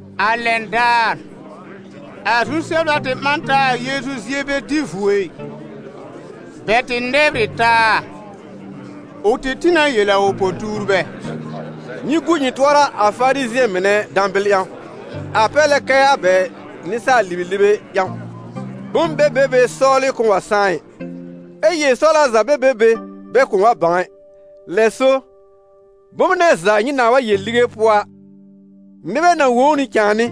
A lɛn daar, a zu-sɛbla tɩ ɓã n taa a Yeezu zie bɛ dɩ vuo ɩ, bɛ tɩ nɛbr ɩ taa. Ʋ tɩ tĩ na yel a ʋ po-tuurbɛ: «Nyɩ gu nyɩ tʋɔra a Farizɩ̃ɛ mɩnɛ dãbɩl ƴãw, a pɛr lɛ kɛ a bɛ nɩsaal-libelibe ƴãw. Bom bɛ be be sɔwlɩ kʋ̃ʋ wa sãá ɩ, ɛ yel-sɔwla za bɛ be be bɛ kʋ̃ʋ wa bãw ɛ. Lɛ so, bom nɛ za nyɩ nãa wa yel lige pʋɔ a, nɩbɛ na wõ ʋ nɩ cãàmɩ́,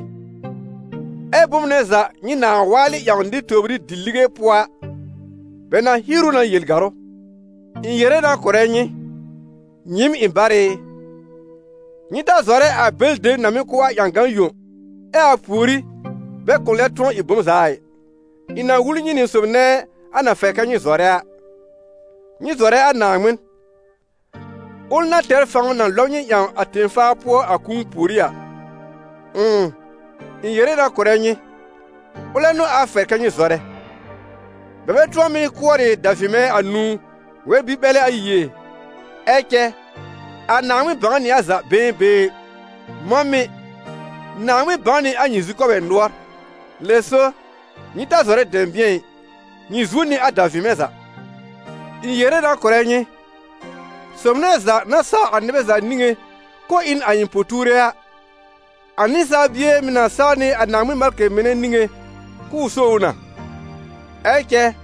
ɛ bom nɛ za nyɩ nãa waalɩ ƴãw nɩr tòbrí di-lige pʋɔ a, bɛ na hier ʋ na yel gàrʋ́.» «Ɩ̃ yere na kʋ̀rɛ nyɩ, nyɩɩm ɩ̃ barɩ ɩ: nyɩ ta zɔrɛ a bɛlɩ dem na mɩ́ kʋ́ a ƴãgan yõ, ɛ a pùorí bɛ kʋ̃ lɛb tʋ̃ɔ ɩ bom za a ɩ. Ɩ̃ na wul nyɩ nɩ sob nɛ a na fɛr kɛ nyɩ zɔrɛ a: nyɩ zɔrɛ a Naaŋmɩn, ʋl na tɛr fãw na lɔb nyɩ ƴãw a tẽ-faa pʋɔ a kũu pùorí a. Ʋ̃ʋ, ɩ̃ yere na kʋ̀rɛ nyɩ, ʋlɛ n'ʋ a fɛr kɛ nyɩ zɔrɛ. Bɛ bɛ tʋ̃ɔ mɩ́ kʋɔrɩ davɩmɛ̃ anũu wɛr-bi-ɓɛlɛ ayi ɛ? Ɛ cɛ a Naaŋmɩn bãw nɩ a za been been. Mɔ̃ mɩ̀, Naaŋmɩn bãw nɩ a nyɩ zukɔbɛ nʋɔr. Lɛ so, nyɩ ta zɔrɛ dɛ̃bɩ̃ɛ ɩ, nyɩ zuo nɩ a davɩmɛ̃ za!» «Ɩ̃ yere na kʋ̀rɛ nyɩ: sob nɛ za na saw a nɩbɛ za niŋé k'ʋʋ ɩ n a ɩ̃ po-tuure a, a Nɩsaal Bie mɩ̀ na saw nɩ a Naaŋmɩn malkɩ mɩnɛ niŋé k'ʋʋ só ʋ na. Ɛ cɛ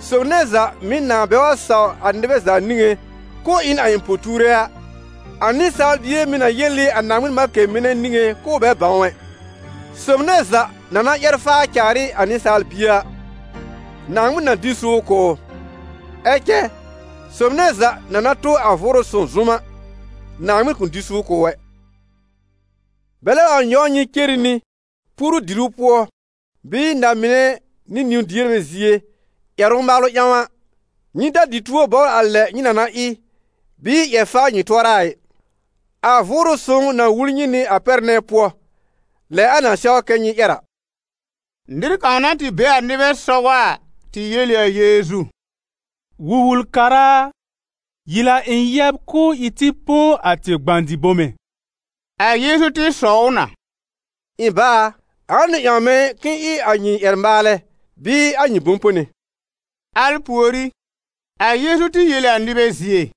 sob nɛ za mɩ̀ nãa bɛ wa saw a nɩbɛ za niŋẽ k'ʋʋ ɩ n a ɩ̃ po-tuure a, a Nɩsaal Bie mɩ̀ na yel ɩ a Naaŋmɩn malkɩ mɩnɛ niŋé k'ʋʋ bɛ bãw ʋ ɛ. Sob nɛ za na na ƴɛr faa caar ɩ a Nɩsaal Bie a, Naaŋmɩn na dɩ n suur kʋ̀ ʋ. Ɛ cɛ sob nɛ za na na tʋ a Vʋʋrʋ Sõw zʋm a, Naaŋmɩn kʋ̃ dɩ suur kʋ̀ ʋ ɛ. Bɛlɛ wa nyɔw nyɩ cere nɩ puoru-diru pʋɔ bɩɩ na-mɩnɛ nɩ niwn-dierbɛ zie ƴɛrʋ-maalʋ ƴãw a, nyɩ ta dɩ tuo bɔbr a lɛ nyɩ na na ɩ, bɩɩ ƴɛr faa nyɩ tʋɔra a ɩ. A Vʋʋrʋ Sõw na wul nyɩ nɩ a pɛr nɛ pʋɔ, lɛ a na sɛw kɛ nyɩ ƴɛr a.» Nɩr kãw na tɩ be a nɩbɛ sɔgɔ a, tɩ yel ɩ a Yeezu: «Wul-wul-kara a, yel a ɩ̃ yɛb k'ʋʋ ɩ tɩ põ a tɩ gbã-dɩ-bome» A Yeezu tɩ sɔw ʋ na: «Ɩ̃ bá a, ãa n'ʋ ƴãw mɛ̃ k'ɩ̃ɩ ɩ a nyɩ ƴɛr-maalɛ bɩɩ a nyɩ bʋ̃-pone?» Al pùorí, a Yeezu tɩ yel ɩ a nɩbɛ zie: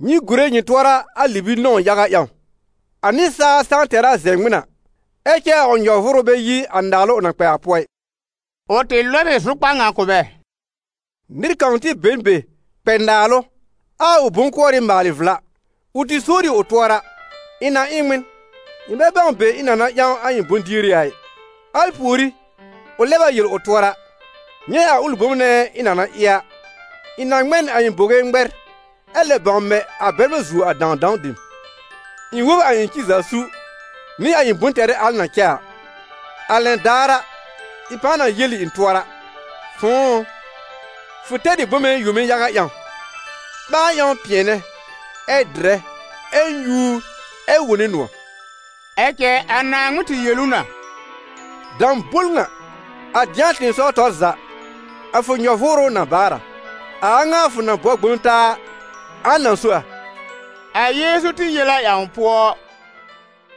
«Nyɩ gùre nyɩ tʋɔra a libi-nɔ̃w yaga ƴãw. A nɩsaal saa tɛr a zɛ̃ ŋmɩn a, ɛ cɛ a ʋ nyɔ-vʋʋrʋ bɛ yi a naalʋ ʋ na kpɛ a pʋɔ ɩ.» Ʋ tɩ lɔb ɩ zʋkpar ŋa kʋ̀ bɛ: «Nɩr kãw tɩ be n be kpɛ naalʋ, ɛ a ʋ bʋ̃-kʋɔrɩ maalɩ vla. Ʋ tɩ sowr ɩ ʋ tʋɔra: ‹Ɩ̃ na ɩ n ŋmɩn? Ɩ̃ bɛ bãw be ɩ̃ na na ƴãw a ɩ̃ bʋ̃-dieri a ɩ! › Al pùorí, ʋ lɛb a yel ʋ tʋɔra: ‹Nyɛ̃ a ʋlɩ bom nɛ ɩ̃ na na ɩ a: ɩ̃ na ŋmɛ n a ɩ̃ bowe ŋmɛr ɛ lɛb bãw mɛ a bɛrmɛ̃ zuo a dãwdãw dem, ɩ̃ wob a ɩ̃ ci za su, nɩ a ɩ̃ bʋ̃-tɛrɩ al na cɛ a. A lɛn daar a, ɩ̃ pãa na yel ɩ̃ tʋɔra: fʋ̃ʋ ʋ, fʋ tɛr ɩ bome yome yaga ƴãw, ɓãa ƴãw pɩ̃ɛnɛ, ɛ dɩrɛ, ɛ nyúur, ɛ wone nʋ̃ɔ̀.› Ɛ cɛ a Naaŋmɩn tɩ yel ʋ na: ‹Dãbol ŋa! A dɩ̃a tɩ̃ɩsɔw tɔr za, a fʋ nyɔ-vʋʋrʋ na baar a. A a ŋa fʋ na bɔ gbõ taa a, ãa na so a?›» A Yeezu tɩ yel a ƴãw pʋɔ: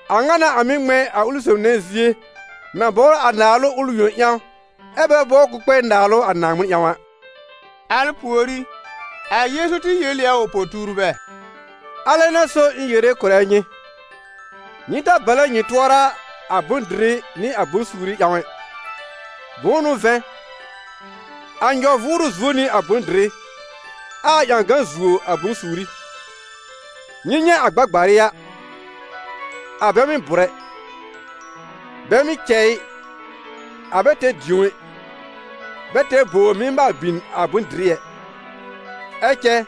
«A ŋa n'a a mɩ́ ŋmɛ̃ a ʋlɩ sob nɛ zie na bɔbr a naalʋ ʋl yõ ƴãw a, ɛ́ bɛ bɔbr k'ʋʋ kpɛ naalʋ a Naaŋmɩn ƴãw a.» Al pùorí, a Yeezu tɩ yel ɩ a ʋ po-tuurbɛ: «Alɛ n'a so ɩ̃ yere kʋ̀rɛ nyɩ: nyɩ ta balɛ nyɩ tʋɔra a bʋ̃-dɩrɩ nɩ a bʋ̃-suuri ƴãw ɛ. Bʋ̃ʋ n'ʋ vɛ̃, a nyɔ-vʋʋrʋ zuo nɩ a bʋ̃-dɩrɩ, ɛ a ƴãgan zuo a bʋ̃-suuri. Nyɩ nyɛ̃ a gbagbarɩ a, a bɛ mɩ́ bʋ̀r ɛ, bɛ mɩ́ cɛ ɩ, a bɛ tɛr dĩo ɛ, bɛ tɛr bowr mɩ́ maal bin a bʋ̃-dɩrɩ ɛ, ɛ cɛ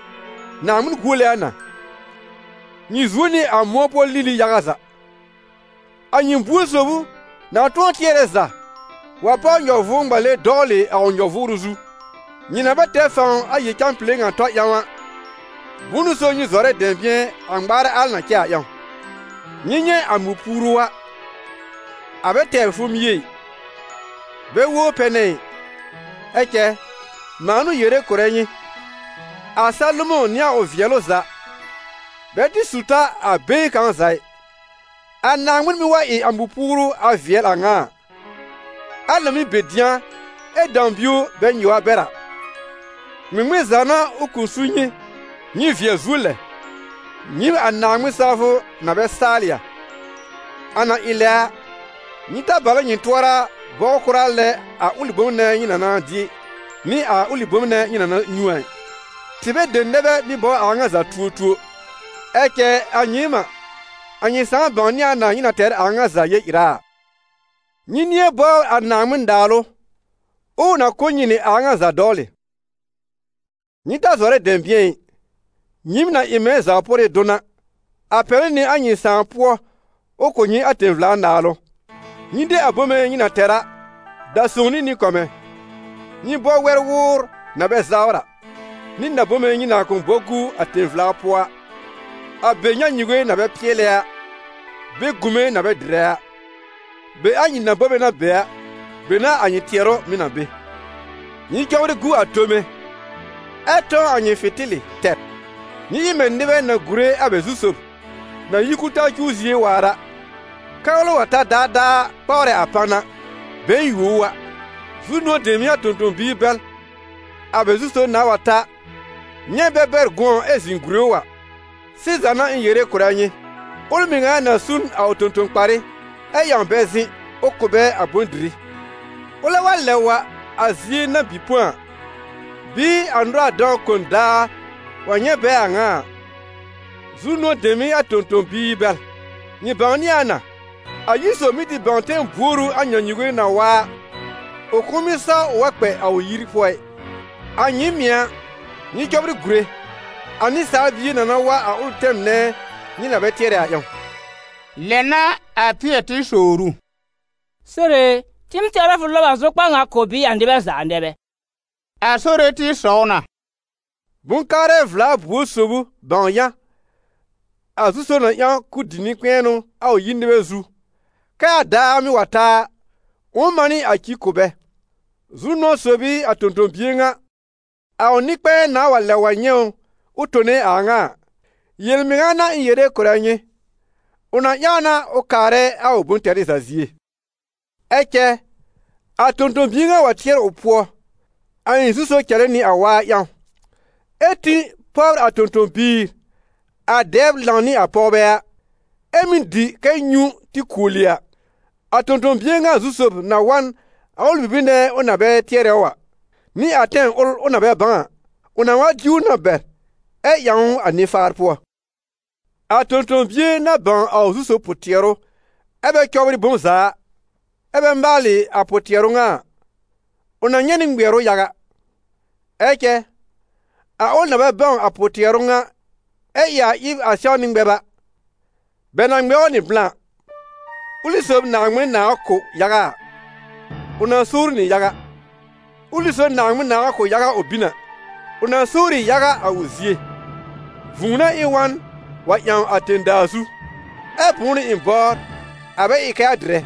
Naaŋmɩn guole a na. Nyɩ zuo nɩ a mʋ̃ɔ pʋɔ lili yaga za. A nyɩ buor sob ʋ na tʋ̃ɔ tɩɛrɛ za wa páw nyɔ-vʋʋr-ŋmale dɔwlɩ a ʋ nyɔ-vʋʋrʋ zu? Nyɩ na bɛ tɛr fãw a yel-cãpile ŋa tɔ ƴãw a, bʋ̃ʋ n'ʋ so nyɩ zɔrɛ dɛ̃bɩ̃ɛ a ŋmaarɛ al na cɛ a ƴãw? Nyɩ nyɛ̃ a mɔ̃-puuru a, a bɛ tɛbr fomie ɛ, bɛ wobr pɛnɛ ɩ, ɛ cɛ mãa n'ʋ yere kʋ̀rɛ nyɩ, a Salomɔ̃ nɩ a ʋ vɩɛlʋ za bɛ tɩ su ta a been kãw za ɩ. A Naaŋmɩn mɩ́ wa ɩ a mɔ̃-puuru a vɩɛl a ŋa a, al na mɩ́ be dɩ̃a ɛ dãw bio bɛ nyɩw a bɛr a, ŋmɩŋmɩn za n'a ʋ kʋ̃ su nyɩ, nyɩ vɩɛl zuo lɛ, nyɩɩm a Naaŋmɩn-sawfʋ na bɛ saalɩ a? A na ɩ lɛ a, nyɩ ta balɛ nyɩ tʋɔra bɔbr kʋra lɛ a ʋlɩ bom nɛ nyɩ na na dɩ, nɩ a ʋlɩ bom nɛ nyɩ na na nyũ a ɩ. Tɩbɛ dem nɛ bɛ mɩ́ bɔbr a a ŋa za tuotuo. Ɛ cɛ a nyɩɩm n'a, a nyɩ Sãà bãwnɩ a na nyɩ na tɛr a a ŋa za yel-ɩra a. Nyɩ nɩ̃ɛ bɔbr a Naaŋmɩn-Naalʋ, ʋʋ na kʋ̀ nyɩ nɩ a a ŋa za dɔwlɩ.» «Nyɩ ta zɔrɛ dɛ̃bɩ̃ɛ ɩ, nyɩɩm na ɩ mɛ̃ zaw-pʋrɩ dʋn a, a pɛlɩ nɩ a nyɩ Sãà pʋɔ ʋ kʋ̀ nyɩ a tẽ-vla Naalʋ. Nyɩ de a bome nyɩ na tɛr a, da sõw nɩ nɩ-kɔmɛ̃. Nyɩ bɔ wɛ-wʋʋr na bɛ zawr a, nɩ na-bome nyɩ na kʋ̃ bɔ gu a tẽ-vla pʋɔ a, a be nyãnyuge na bɛ pɩɛlɛ a, be gũme na bɛ dɩrɛ a. Be a nyɩ na-bome na be a, be n'a a nyɩ tɩɛrʋ mɩ̀ na be.» «Nyɩ cɔbrɩ gu a tome, ɛ tɔ̃w a nyɩ fɩ̃tɩlɩ tɛr. Nyɩ ɩ mɛ̃ nɩbɛ na gùre a bɛ zu-sob na yi kul-taa cuw zie waar a, kɛ́ ʋlɛ wa ta daadaa kpawrɛ a pan a, bɛ̃ɛ yuo ʋ a. Zu-nʋ̃ɔ̀ dem n'ɩ a tõ-tõ-biir bɛl, a bɛ zu sob nãa wa ta nyɛ̃ bɛ bɛr gʋ̃ɔ ɛ zɩ̃ gùre ʋ a! Sɩza n'a ɩ̃ yere kʋ̀rɛ nyɩ: ʋl mɩŋa na su n a ʋ tõ-tõ-kparɩ, ɛ ƴãw bɛ zɩ̃, ʋ kʋ̀ bɛ a bʋ̃-dɩrɩ. Ʋlɛ wa lɛb wa a zie na bɩ põ a, bɩɩ a nʋra-dãw kon daar wa nyɛ̃ bɛ a a ŋa a, zu-nʋ̃ɔ̀ dem n'ɩ a tõ-tõ-biir bɛl!» «Nyɩ bãwnɩ a na: a yir sob mɩ́ tɩ bãw tɛm buor ʋ a nyãnyuge na wa a, ʋ kʋ̃ʋ mɩ́ saw ʋ wa kpɛ a ʋ yir pʋɔ ɩ. A nyɩɩm mɩ̀ a, nyɩ cɔbrɩ gùre: a Nɩsaal Bie na na wa a ʋlɩ tɛm nɛ nyɩ na bɛ tɩɛrɛ a ƴãw.» Lɛ n'a a Pɩɛr tɩ sowr ʋ: «Sore e, tɩɩm tɛwr a fʋ lɔb a zʋkpar ŋa kʋ̀ bɩɩ a nɩbɛ za nɛ bɛ?» A Sore tɩ sɔw na: «Bʋ̃-kaarɛ vla buor sob ʋ, bãw yã, a zu-sob na ƴãw k'ʋ dɩ nɩ-kpɛ̃ɛnʋ a ʋ yir nɩbɛ zu, kɛ́ a daar mɩ́ wa ta a, ʋ̃ʋ manɩ a ci kʋ̀ bɛ? Zu-nʋ̃ɔ̀ sob n'ɩ a tõ-tõ-bie ŋa, a ʋ nɩ-kpɛ̃ɛ nãa wa lɛb wa nyɛ̃ ʋ tone a a ŋa a. Yel-mɩŋa n'a ɩ̃ yere kʋ̀rɛ nyɩ, ʋ na ƴãw na ʋ kaarɛ a ʋ bʋ̃-tɛrɩ za zie. Ɛ cɛ a tõ-tõ-bie ŋa wa tɩɛr ʋ pʋɔ: ‹A ɩ̃ zu-sob cɛlɛ nɩ a waa ƴãw›, ɛ tĩ pɔbr a tõ-tõ-biir, a dɛbr lãw nɩ a pɔwbɛ a, ɛ mɩ́ dɩ kɛ nyũ tɩ kuoli a, a tõ-tõ-bie ŋa zu-sob na wa n a ʋlɩ bibir nɛ ʋ na bɛ tɩɛrɛ ʋ a, nɩ a tɛm ʋl ʋ na bɛ bãw a; ʋ na wa diw ʋ na bɛr, ɛ ƴãw ʋ a nɩ-faar pʋɔ. A tõ-tõ-bie na bãw a ʋ zu-sob pʋ-tɩɛrʋ ɛ bɛ cɔbrɩ bom za a, ɛ bɛ maalɩ a pʋ-tɩɛrʋ ŋa a, ʋ na nyɛ̃ nɩ ŋmɩɛrʋ yaga. Ɛ cɛ a ʋl na bɛ bãw a pʋ-tɩɛrʋ ŋa ɛ ɩ a ɩb a sɛwnɩ ŋmɛb a, bɛ na ŋmɛ ʋ nɩ blã. Ʋlɩ sob Naaŋmɩn nãà wa kʋ̀ yaga a, ʋ na sowr ʋ nɩ yaga; ʋlɩ sob Naaŋmɩn nãa wa kʋ̀ yaga ʋ bin a, ʋ na sowr ɩ yaga a ʋ zie.» «Vũu n'a ɩ̃ wa n wa ƴãw a tẽ-daa zu, ɛ bʋ̃ʋ n'ʋ ɩ̃ bɔbr, a bɛ ɩ kɛ a dɩrɛ?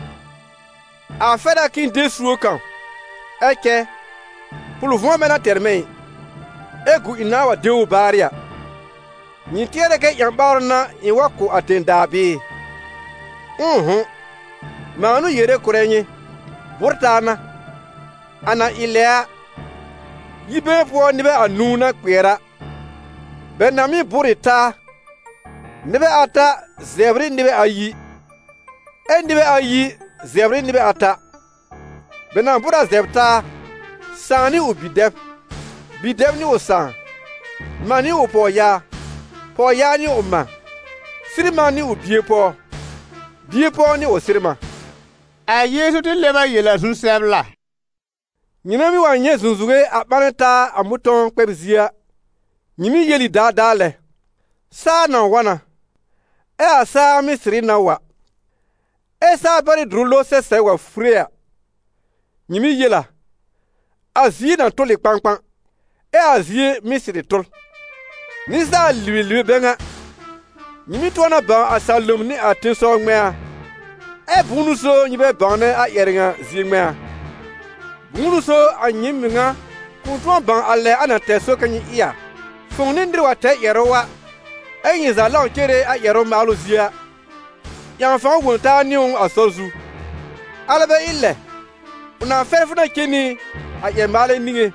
A fɛr a k'ɩ̃ɩ de suob kãw, ɛ cɛ pʋl-vʋ̃ɔ bɛ n'a tɛr mɛ̃ ɩ, ɛ gu ɩ̃ nãa wa de ʋ baarɩ a! Nyɩ tɩɛrɛ kɛ ƴã-ɓaarʋ n'a ɩ̃ wa kʋ̀ a tẽ-daa bɩɩ? Ʋ̃ʋ'hʋ̃! Mãa n'ʋ yere kʋ̀rɛ nyɩ, bʋ́r-taa n'a. A na ɩ a lɛ a, yi-been pʋɔ nɩbɛ anũu na kpɩɛr a, bɛ na mɩ́ bʋ́r ɩ taa: nɩbɛ ata zɛbr ɩ nɩbɛ ayi, ɛ nɩbɛ ayi zɛbr ɩ nɩbɛ ata: bɛ na bʋ́r a zɛbr taa, sãà nɩ ʋ bi-dɛb, bi-dɛb nɩ ʋ sãà, mã nɩ ʋ pɔwyaa, pɔwyaa nɩ ʋ mã, sɩr-mã nɩ ʋ bie-pɔw, bie-pɔw nɩ ʋ sɩr-mã.» A Yeezu tɩ lɛb a yel a zu-sɛbla: «Nyɩmɛ mɩ́ wa nyɛ̃ zũzuwe a ɓanɛ taa a mʋ̃tɔ̃w-kpɛb-zie a, nyɩ mɩ́ yel ɩ daadaa lɛ: ‹Saa na wa na›, ɛ a saa mɩ́ sɩrɩ na wa. Ɛ saa-pɛrɩ́-dʋrʋ lowr sɛsɛb wa fure a, nyɩ mɩ́ yel a: ‹A zie na tʋl ɩ kpãkpã›, ɛ a zie mɩ́ sɩrɩ tʋl. Nɩsaal-libelibe bɛ ŋa! Nyɩ mɩ́ tʋ̃ɔ na bãw a salom nɩ a tẽsɔw ŋmɛ̃a, ɛ bʋ̃ʋ n'ʋ so nyɩ bɛ bãwnɛ a ƴɛrɛ ŋa zie ŋmɛ̃a?» «Bʋ̃ʋ n'ʋ so a nyɩɩm mɩŋa kʋ̃ tʋ̃ɔ bãw a lɛ a na tɛr sɔr kɛ nyɩ ɩ a? Fʋ̃ʋ nɩ nɩr wa tɛr ƴɛrʋ a, ɛ́ nyɩ za lãw cere a ƴɛrʋ-maalʋ zie a, ƴãw fãw wõ taa nɩ ʋ a sɔr zu; alɛ bɛ ɩ lɛ, ʋ na fɛr fʋ na cen nɩ a ƴɛr-maalɛ niŋé,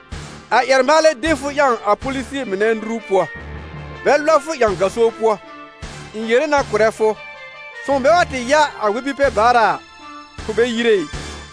a ƴɛr-maalɛ de fʋ ƴãw a polisie mɩnɛ nuru pʋɔ, bɛ lɔb fʋ ƴãw gaso pʋɔ. Ɩ̃ yere na kʋ̀rɛ fʋ: fʋ̃ʋ bɛ wa tɩ ya a wɛ-bi-pɛ-baara a, fʋ bɛ yire ɩ.»